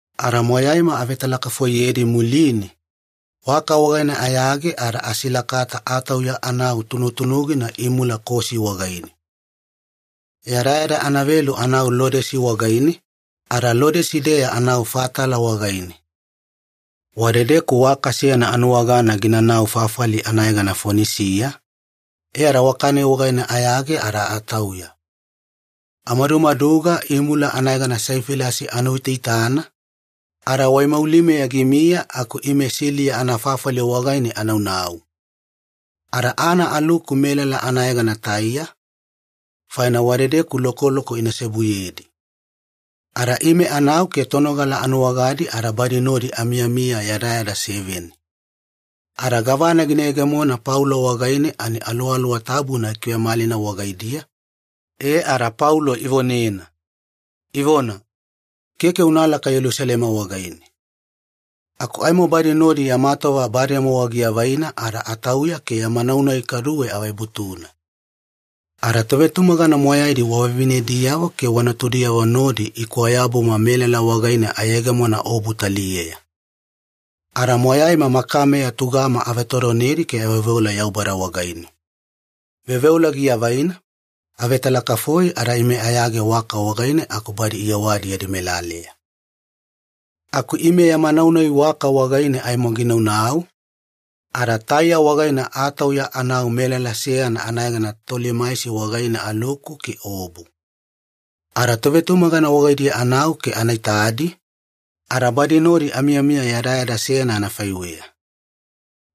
Ada moyaima avetalakafoiyedi muline, waka wagaine ayage ada asilakata atauya anau tunutunugina imula Kosi wagaine. Yadayada anavelu anau Lodesi wagaine, ada Lodesi-deya anau Fatala wagaine. Wadedeku waka seyana anuwagana ginanau fafali anayegana Fonisiya, e ada waka-nai wagaine ayage ada atauya. Amadumaduga imula anayegana Saifilasi anuitaitana, ada waimaulimeya gimiya aku ime Siliya anafafali wagaine anaunau. Ada ana aluku melala anayegana Taiya, faina wadedeku lokoloko ina seobuyedi. Ada ime anau ke tonogala anuwagadi ada badi nodi amiyamiya yadayada seveni. Ada gavana gina yegemona Paulo wagaine ani Aluwaluwa Tabuna gikivemalina wagaidiya, e ada Paulo ivonena, ivona, “Keke unalaka Yelusalema wagaine.” Aku aimo badi nodi yama tova bademowa giavaina ada atauya ke yama nau-nai kaduwe avebutuna. Ada tovetumagana moyaidi wa vavinediyavo ke wa natudiyavo nodi ikwayabuma melala wagaine ayegemona aobu taliyeya. Ada moyaima makameya tugama avetodonedi ke aveoveola Yaubada wagaine. Veoveola giavaina, avetalakafoi ada ime ayage waka wagaine aku badi iyewadi yadi melaleya. Aku ime yama nau-nai waka wagaine aimo ginaunau, ada Taiya wagaine atauya anau melala seyana anayegana Tolimaisi wagaine aluku ke aobu. Ada tovetumagana wagaidiya anau ke ana itadi, ada badi nodi amiyamiya yadayada seyana anafaiweya.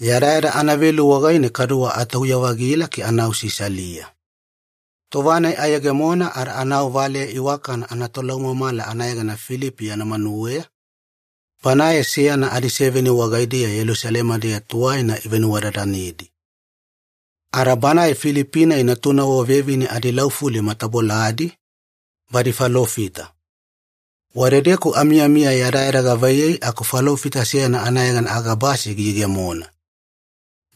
Yadayada anavelu wagaine kaduwe atauya-vagila ke anau Sisalia. Tova-nai ayegemona ada anau valeya iwakana anatolaumamala anayegana Filipi yana manuweya, banae seyana adiseveni wagaidiya Yelusalema-deya tuwaina ivenuwadadanedi. Ada banae Filipi-nai natunavo vevine adilaufuli mataboladi, badi falofita. Wadedeku amiyamiya yadayada gavaiyei aku falofita seyana anayegana Agabasi giyegemona.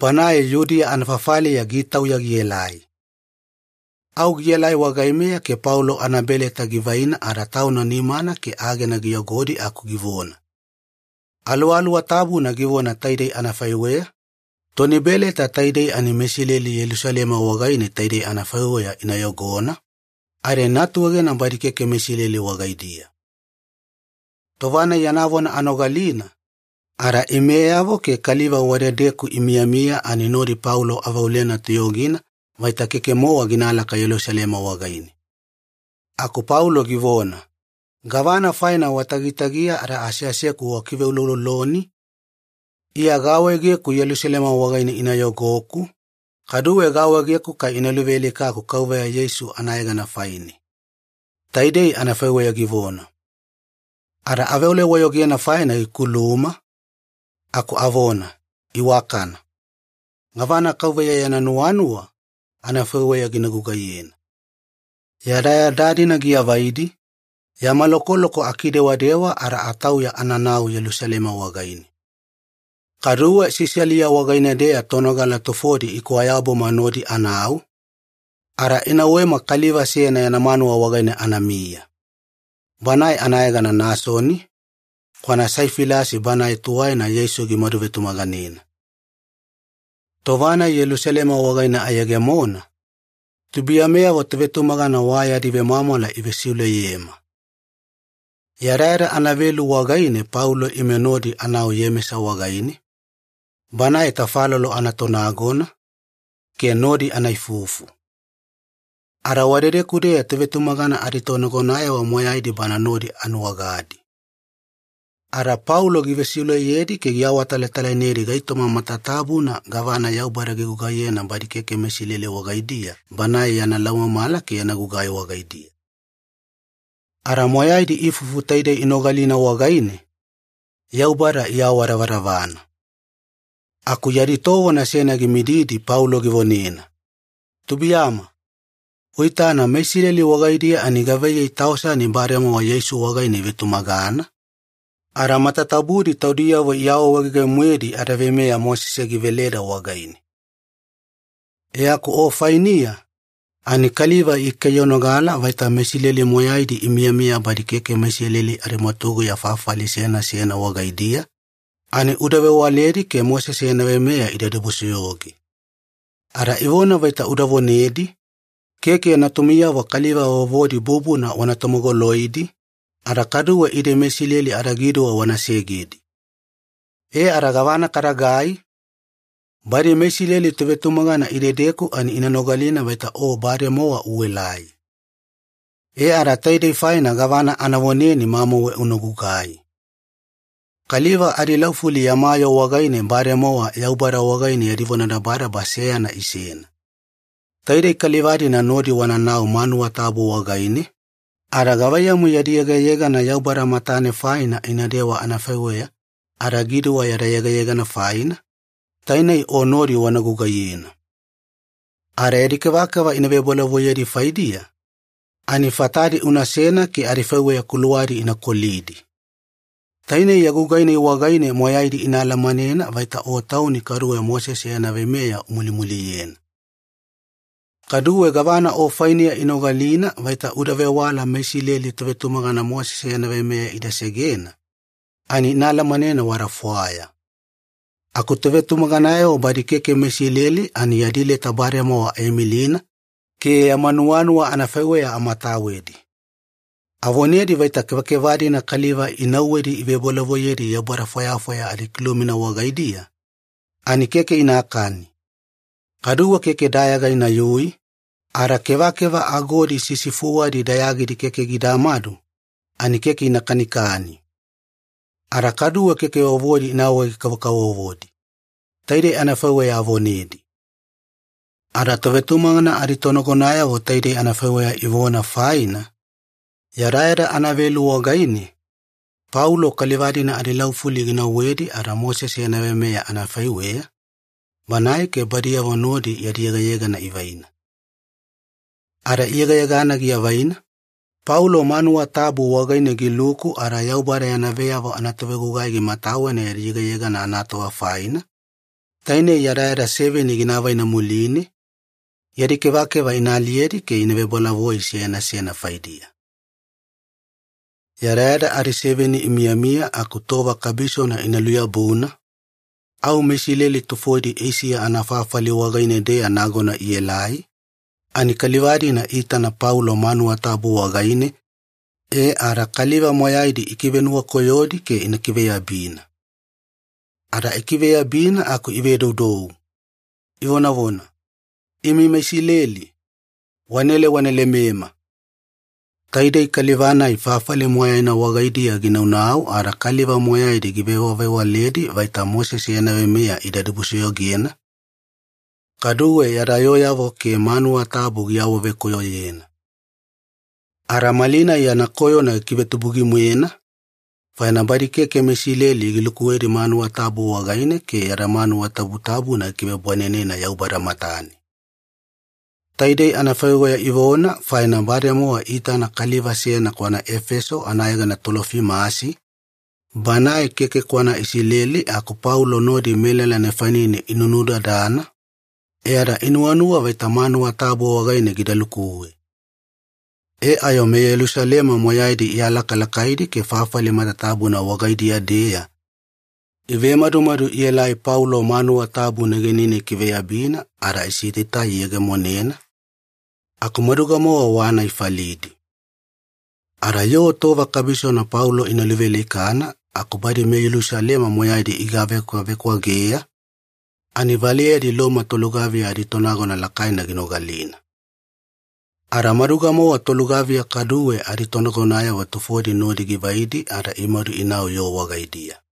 Banae Yudiya anafafaliya gitauya gielai. Au gielai wagaimeya ke Paulo anabeleta givaina ada tauna nimana ke agena giyogodi aku givona, “Aluwaluwa Tabuna givona taidei anafaiweya, ‘Toni beleta taidei ani meIsileli Yelusalema wagaine taidei anafaiweya ina yogona, ada ina atuegena badi keke meIsileli wagaidiya.’” Tova-nai yana vona anogalina, ada imeyavo ke kaliva wadedeku imiyamiya ani nodi Paulo aveolena toyogina vaita keke-mowa ginalaka Yelusalema wagaine. Aku Paulo givona, “Gavana faina watagitagiya ada aseaseku wakiveulouloloni? Iya gaawaegeku Yelusalema wagaine ina yogoku, kaduwe gaawaegeku kai ina luvealikaku Kauveya Yeisu anayegana faine.” Taidei anafaiweya givona. Ada aveola-wayogena faina gikuluma, aku avona, “Iwakana. Gavana Kauveya yana nuwanuwa, anafaiweya gina gugaiyena.” Yadayada-dina giavaidi, yama lokoloko akidewadewa ada atauya ananau Yelusalema wagaine. Kaduwe Sisalia wagaine-deya tonogala tufodi ikwayabuma nodi anau, ada inauwema kaliva seyana yana manuwa wagaine anamiya. Banae anayegana Nasoni, kwana Saifilasi banae tuwaina Yeisu gimadu vetumaganena. Tova-nai Yelusalema wagaine ayegemona, tubuiyameyavo tovetumagana wa yadi vemwamwala ivesiuleyema. Yadayada anavelu wagaine Paulo ime nodi anau Iyemesa wagaine, banae tafalolo anatonagona, ke nodi ana ifufu. Ada wadedeku-deya tovetumagana aditonagonayavo moyaidi bana nodi anuwagadi. Ada Paulo givesiuleyedi ke giawatalatalainedi gaitoma matatabuna gavana Yaubada gigugaiyena badi keke meIsileli wagaidiya banae yana laumamala ke yana gugai wagaidiya. Ada moyaidi ifufu taidei inogalina wagaine, Yaubada iawadavadavana. Aku yadi tovona seyana gimididi Paulo givonena, “Tubuiyama, uitana meIsileli wagaidiya ani gavaiyei tausani bademowa Yeisu wagaine ivetumagana, ada matatabudi taudiyavo iawaawaege-moedi adaveimeya Mosese giveleda wagaine. E aku o fainiya, ani kaliva ikaiyanogala vaita meIsileli moyaidi imiyamiya badi keke meIsileli adimwatuguya fafali seyana seyana wagaidiya, ani uda vewaledi ke Mosese yana veimeya ida dibusoyoge. Ada ivona vaita uda vonedi, ‘Keke natumiyavo kaliva vovodi bubuna wana tomogoloidi, ada kaduwe ide meIsileli adagiduwa wana segedi.’ E ada gavana kadagai? Badi meIsileli tovetumagana idedeku ani ina nogalina vaita o bademowa uelai. E ada taidei faina gavana ana voneni, mamauwe una gugai. Kaliva adilaufuli yama yoo wagaine bademowa Yaubada wagaine yadi vonadabadaba seyana isena. Taidei kaliva-dina nodi wananau manuwa tabu wagaine, ada gavaiyamu yadi yegayegana Yaubada matane faina inadewa anafaiweya adagiduwa yada yegayegana faina, tainei o nodi wana gugaiyena. Ada yadi kevakeva ina vebolavoiyedi faidiya, ani fatadi unasena ke adifaiweya kuluwadi ina kolidi. Tainei ya gugai-nai wagaine moyaidi ina alamanena vaita o tauni kaduwe Mosese yana veimeya umulimuliyena. Kaduwe gavana o fainiya inogalina vaita uda vewala meIsileli tovetumagana Mosese yana veimeya ida segena, ani ina alamanena wada fwaya. Aku tovetumaganayavo badi keke meIsileli ani yadi leta bademowa aimilina ke yama nuwanuwa anafaiweya amatawedi. Avonedi vaita kevakeva-dina kaliva inauwedi ivebolavoiyedi yaubada fwayafwaya adikilumina wagaidiya, ani keke inakani. Kaduwe keke dayaga inayui, ada kevakeva agodi sisifuwadi dayagidi keke gidamadu, ani keke ina kanikani. Ada kaduwe keke vovodi ina awawege-kavokavovodi. Taidei anafaiweya avonedi.” Ada tovetumagana aditonagonayavo taidei anafaiweya ivona faina, yadayada anavelu wagaine Paulo kaliva-dina adilaufuli ginauwedi ada Mosese yana veimeya anafaiweya, banae ke badiyavo nodi yadi yegayegana ivaina. Ada iyegayegana giavaina, Paulo manuwa tabu wagaine giluku ada Yaubada yana veyavo anatovegugai gimatawena yadi yegayegana anatova faina, tainei yadayada seveni gina avaina muline, yadi kevakeva ina aliyedi ke gina vebolavoi seyana seyana faidiya. Yadayada adiseveni imiyamiya aku tova kabisona ina luyabuna, au meIsileli tufodi Eisiya anafafali wagaine-deya nagona ielai, ani kaliva-dina iitana Paulo manuwa tabu wagaine e ada kaliva moyaidi ikivenuwakoyodi ke ina kiveyabina. Ada ikiveyabina aku ivedoudou, ivonavona, “Imi meIsileli, wanaela wana lemema! Taidei kaliva-nai fafali moyaina wagaidiya ginaunau ada kaliva moyaidi givewavewaledi vaita Mosese yana veimeya ida dibusoyogena, kaduwe yada yooyavo ke manuwa tabu giawavekoyoyena. Ada malinai yana koyona gikivetubugi-moena, faina badi keke meIsileli gilukuwedi manuwa tabu wagaine ke yada manuwa tabutabuna gikivebwanenena Yaubada matane!” Taidei anafaiweya ivona faina bademowa iitana kaliva seyana kwana Efeso anayegana Tolofimasi, banae keke kwana Isileli aku Paulo nodi melala nefanine inunudadana, e ada inuwanuwa vaita manuwa tabu wagaine gida lukuwe. E ayo meYelusalema moyaidi ialakalakaidi ke fafali matatabuna wagaidiya-deya ivemadumadu ielai Paulo manuwa tabu negenine ikiveyabina ada isitaitai iyegemonena, aku maduga-mowa wana ifalidi. Ada yoo tova kabisona Paulo ina luvealikana aku badi meYelusalema moyaidi igavekwavekwageya, ani valeyadi Loma tolugaviya aditonagona lakaina ginogalina. Ada maduga-mowa tolugaviya kaduwe aditonagonayavo tufodi nodi givaidi ada imadu inau yoo wagaidiya.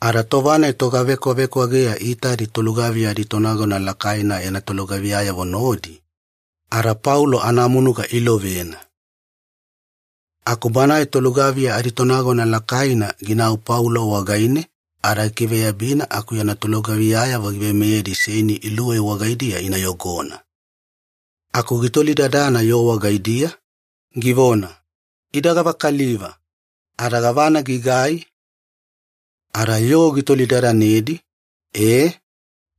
Ada tova-nai togavekwavekwageya iitadi tolugaviya aditonagona lakaina yana tolugaviyayavo nodi, ada Paulo anamunuga iilovena. Aku banae tolugaviya aditonagona lakaina ginau Paulo wagaine ada gikiveyabina aku yana tolugaviyayavo giveimeyedi seini iluwei wagaidiya ina yogona. Aku gitolidadana yoo wagaidiya, givona, “Ida gavakaliva, ada gavana gigai?” Ada yoo gitolidadanedi, ee,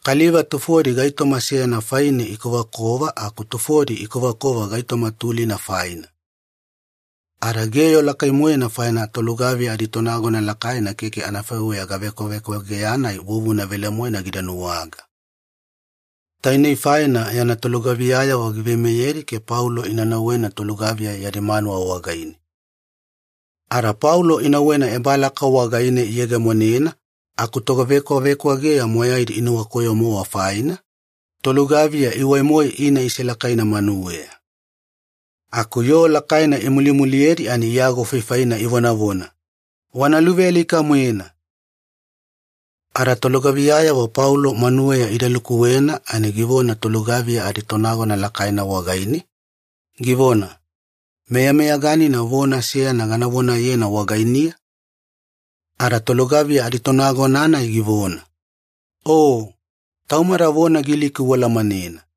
kaliva tufodi gaitoma seyana faine ikovakova aku tufodi ikovakova gaitoma tulina faina. Ada geyo lakai-moena faina tolugaviya aditonagona lakaina keke anafaiweya gavekwavekwageya-nai vuvuna velemoena gida nuwaga. Tainei faina yana tolugaviyayavo giveimeyedi ke Paulo ina nauwena tolugaviya yadi manuwa wagaine. Ada Paulo inauwena ebalaka wagaine iyegemonena aku togavekwavekwageya moyaidi inuwakoyo-mowa faina, tolugaviya iwai-moe ina selakaina manuweya. Aku yoo lakaina imulimuliyedi ani iagofaifaina ivonavona, “Wana luvealika-moena!” Ada tolugaviyayavo Paulo manuweya ida lukuwena ani givona tolugaviya aditonagona lakaina wagaine, givona, “Meyameyaganina vona seyana gana vonayena wagainiya?” Ada tolugaviya aditonagona-nai givona, “O! Taumada vona Giliki ualamanena.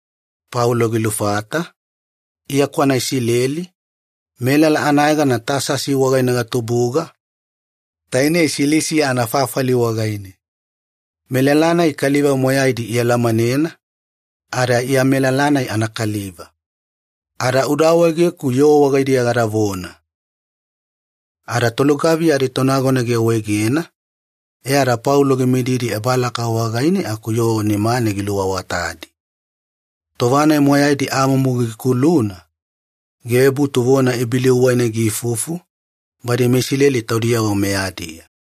Paulo gilufata, “Iya kwana Isileli, melala anayegana Tasasi wagaine gatubuga, tainei Silisiya anafafali wagaine. Melala-nai kaliva moyaidi ialamanena, ada Iya melala-nai anakaliva. Ada uda awaegeku yoo wagaidiya gadavona.” Ada tolugaviya aditonagona giawaegena, e ada Paulo gimididi ebalaka wagaine aku yoo nimane giluawatadi. Tova-nai moyaidi amumu gikuluna, givebutu vona Ibeliu wagaine giifufu, badi meIsileli taudiyavo meyadiya.